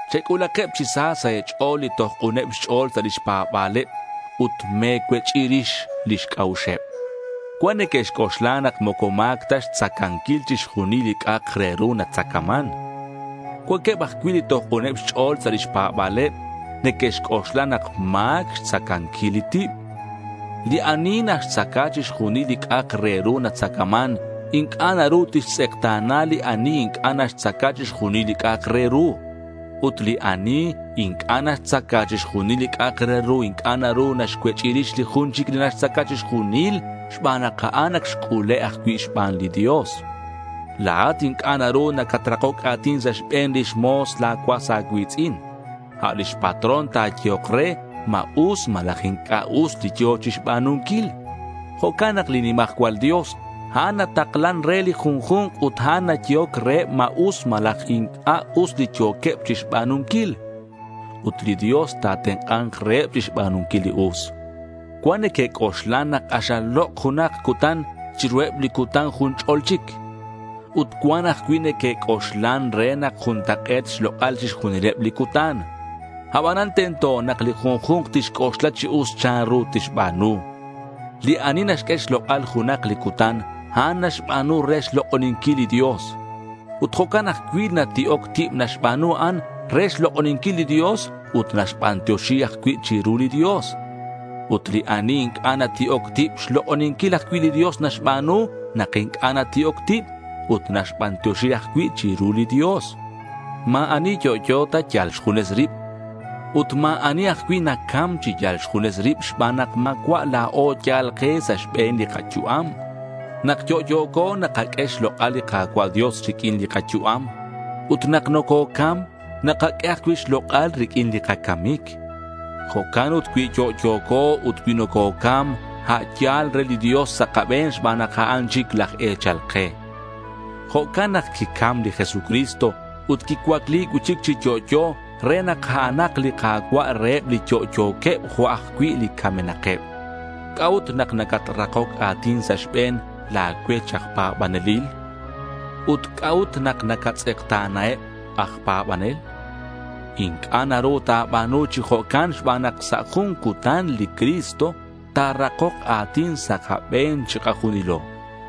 Chec'ulakeb chi sa sa' e̱ch'o̱l li toj k'uneb xch'o̱l sa' lix pa̱ba̱leb ut me̱cuech'i rix lix c'a'uxeb. Cuan neque'xc'oxla nak moco ma̱c ta xtzacanquil chixjunil li c'a'ak re ru natzacaman. Cuanqueb ajcui' li toj k'uneb xch'o̱l sa' lix pa̱ba̱leb neque'xc'oxla nak ma̱c xtzacanquil li tib. Li ani naxtzaca chixjunil li c'a'ak re ru natzacaman inc'a' naru tixtz'ekta̱na li ani inc'a' naxtzaca chixjunil li c'a'ak re ru. Ut li ani inc'a' naxtzaca chixjunil li c'a'ak re ru inc'a' naru naxcuech'i rix li jun chic li naxtzaca chixjunil xban nak a'an ac xc'ule' ajcui' xban li Dios. La̱at inc'a' naru nacatrakoc a̱tin sa' xbe̱n lix mo̱s la̱ cuas a̱cui̱tz'in. A' lix patrón ta̱yehok re ma us malaj inc'a' us li yo̱ chixba̱nunquil. Jo'can nak li nimajcual Dios a'an nataklan re li junju̱nk ut a'an nayehoc reheb ma us malaj inc'a' us li yo̱queb chixba̱nunquil. Ut li Dios ta̱tenk'a̱nk reheb chixba̱nunquil li us. Cuan neque'c'oxlan nak k'axal lok' junak cutan chiruheb li cutan jun ch'o̱l chic. Ut cuan ajcui' neque'c'oxlan re nak juntak'e̱t xlok'al chixjunileb li cutan. Abanan tento nak li junju̱nk tixc'oxla chi us chanru tixba̱nu. Li ani naxq'ue xlok'al junak li cutan, a'an naxba̱nu re xlok'oninquil li Dios. Ut jo'can ajcui' li nati'oc tib naxba̱nu a'an re xlok'oninquil li Dios ut naxbantioxi ajcui' chiru li Dios. Ut li ani inc'a' nati'oc tib, xlok'oninquil ajcui' li Dios naxba̱nu nak inc'a' nati'oc tib, ut naxbantioxi ajcui' chiru li Dios. Ma̱ ani yo'yo ta yal xjunes rib. Ut ma̱ ani ajcui' nacam chi yal xjunes rib xban nak ma̱cua' la̱o yal ke sa' xbe̱n li kayu'am. Nak yo'yo̱co nakaq'ue xlok'al li Ka̱cua' Dios riq'uin li kayu'am. Ut nak nococam, nakaq'ue ajcui' xlok'al riq'uin li kacamic. Jo'can ut cui yo'yo̱co ut cui nococam a' yal re li Dios sa' kabe̱n xban nak a'an chic laj e̱chal ke. Jo'can nak quicam li Jesucristo, ut quicuacli cui'chic chi yo'yo re nak a'anak li Ka̱cua' reheb li yo'yo̱queb jo' eb ajcui' li camenakeb. ¿C'a'ut nak nacatrakoc a̱tin sa' xbe̱n la̱ cuech aj pa̱banelil? Ut ¿c'a'ut nak nacatz'ekta̱naheb aj pa̱banel? Inc'a' naru ta̱ba̱nu chi jo'can xban nak sa' jun cutan li Cristo ta̱rakok a̱tin sa' kabe̱n chikajunilo.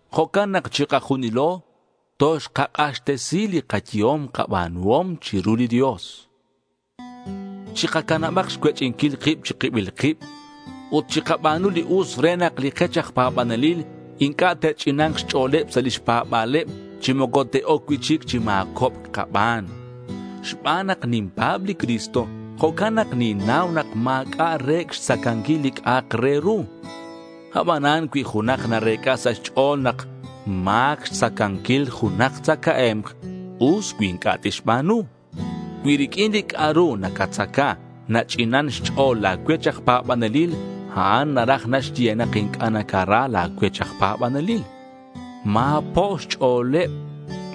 Jo'can nak chikajunilo toxkak'axtesi li kayehom kaba̱nuhom chiru li Dios. Chikacanabak xcuech'inquil kib chi kibil kib ut chikaba̱nu li us re nak li kech aj pa̱banelil inc'a' te'ch'ina̱nk xch'o̱leb sa' lix pa̱ba̱leb chi moco te'oc cui'chic chi ma̱cobc kaban. Xban nak ninpa̱b li Cristo, jo'can nak ninnau nak ma̱c'a' re̱c' xtzacanquil li c'a'ak re ru. Abanan cui junak narec'a sa' xch'o̱l nak ma̱c xtzacanquil junak tzacae̱mk, us cui inc'a' tixba̱nu. Cui riq'uin li c'a'ru nacatzaca nach'inan xch'o̱l la̱ cuech aj pa̱banelil, a'an naraj naxye nak inc'a' nacara la̱ cuech aj pa̱banelil. Ma̱po' xch'o̱leb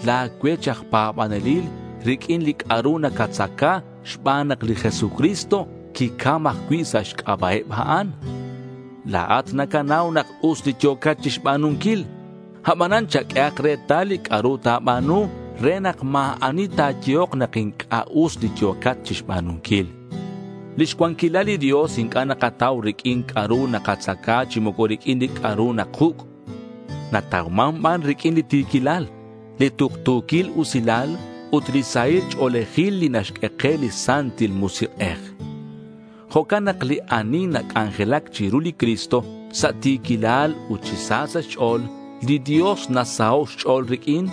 la̱ cuech aj pa̱banelil riq'uin li c'a'ru nacatzaca xban nak li Jesucristo quicam ajcui' sa' xc'aba' eb a'an. La̱at nacanau nak us li yo̱cat chixba̱nunquil, abanan chaq'uehak retal li c'a'ru ta̱ba̱nu re nak ma̱ ani ta̱yehok nak inc'a' us li yo̱cat chixba̱nunquil. Lix cuanquilal li Dios inc'a' nakatau riq'uin c'a'ru nakatzaca chi moco riq'uin li c'a'ru nakuc'; natauman ban riq'uin li ti̱quilal, li tuktu̱quil usilal ut li sahil ch'o̱lejil li naxq'ue ke li Santil Musik'ej. Jo'can nak li ani nac'anjelac chiru li Cristo sa' ti̱quilal ut chi sa sa' xch'o̱l, li Dios nasaho' xch'o̱l riq'uin.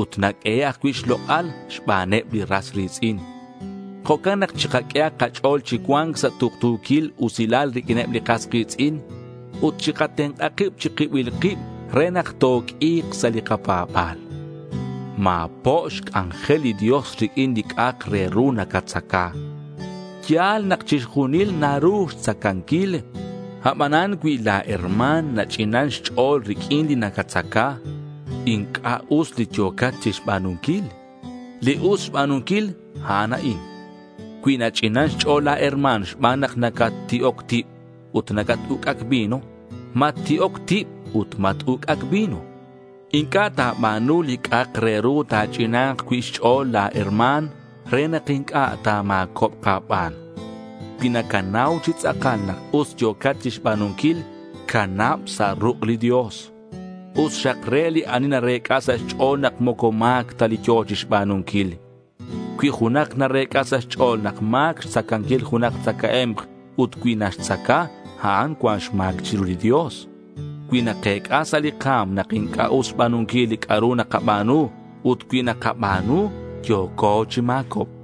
Ut naq'uehe' ajcui' xlok'al xbaneb li ras ri̱tz'in. Jo'can nak chikaq'uehak kach'o̱l chi cua̱nc sa' tuktu̱quil usilal riq'uineb li kas ki̱tz'in. Ut chikatenk'a kib chi kibil kib re nak toq'ui̱k sa' li kapa̱ba̱l. Ma̱po' xc'anjel li Dios riq'uin li c'a'ak re ru nacatzaca. Ya̱l nak chixjunil naru xtzacanquil. Abanan cui la̱ herma̱n nach'inan xch'o̱l riq'uin li nacatzaca, inc'a' us li yo̱cat chixba̱nunquil. Li us xba̱nunquil, a'an a'in: cui nach'inan xch'o̱l la̱ herma̱n xban nak nacatti'oc tib ut nacat-uc'ac vino, matti'oc tib ut mat-uc'ac vino. Inc'a' ta̱ba̱nu li c'a'ak re ru ta̱ch'ina̱nk cui' xch'o̱l la̱ herma̱n re nak inc'a' ta̱ma̱cobk a̱ban. Cui nacanau chi tz'akal nak us yo̱cat chixba̱nunquil, canab sa' ruk' li Dios. Us xak re li ani narec'a sa' xch'o̱l nak moco ma̱c ta li yo̱ chixba̱nunquil. Cui junak narec'a sa' xch'o̱l nak ma̱c xtzacanquil junak tzacae̱mk, ut cui naxtzaca, a'an cuan xma̱c chiru li Dios. Cui nakec'a sa' li ka̱m nak inc'a' us xba̱nunquil li c'a'ru nakaba̱nu, ut cui nakaba̱nu, yo̱co chi ma̱cobc.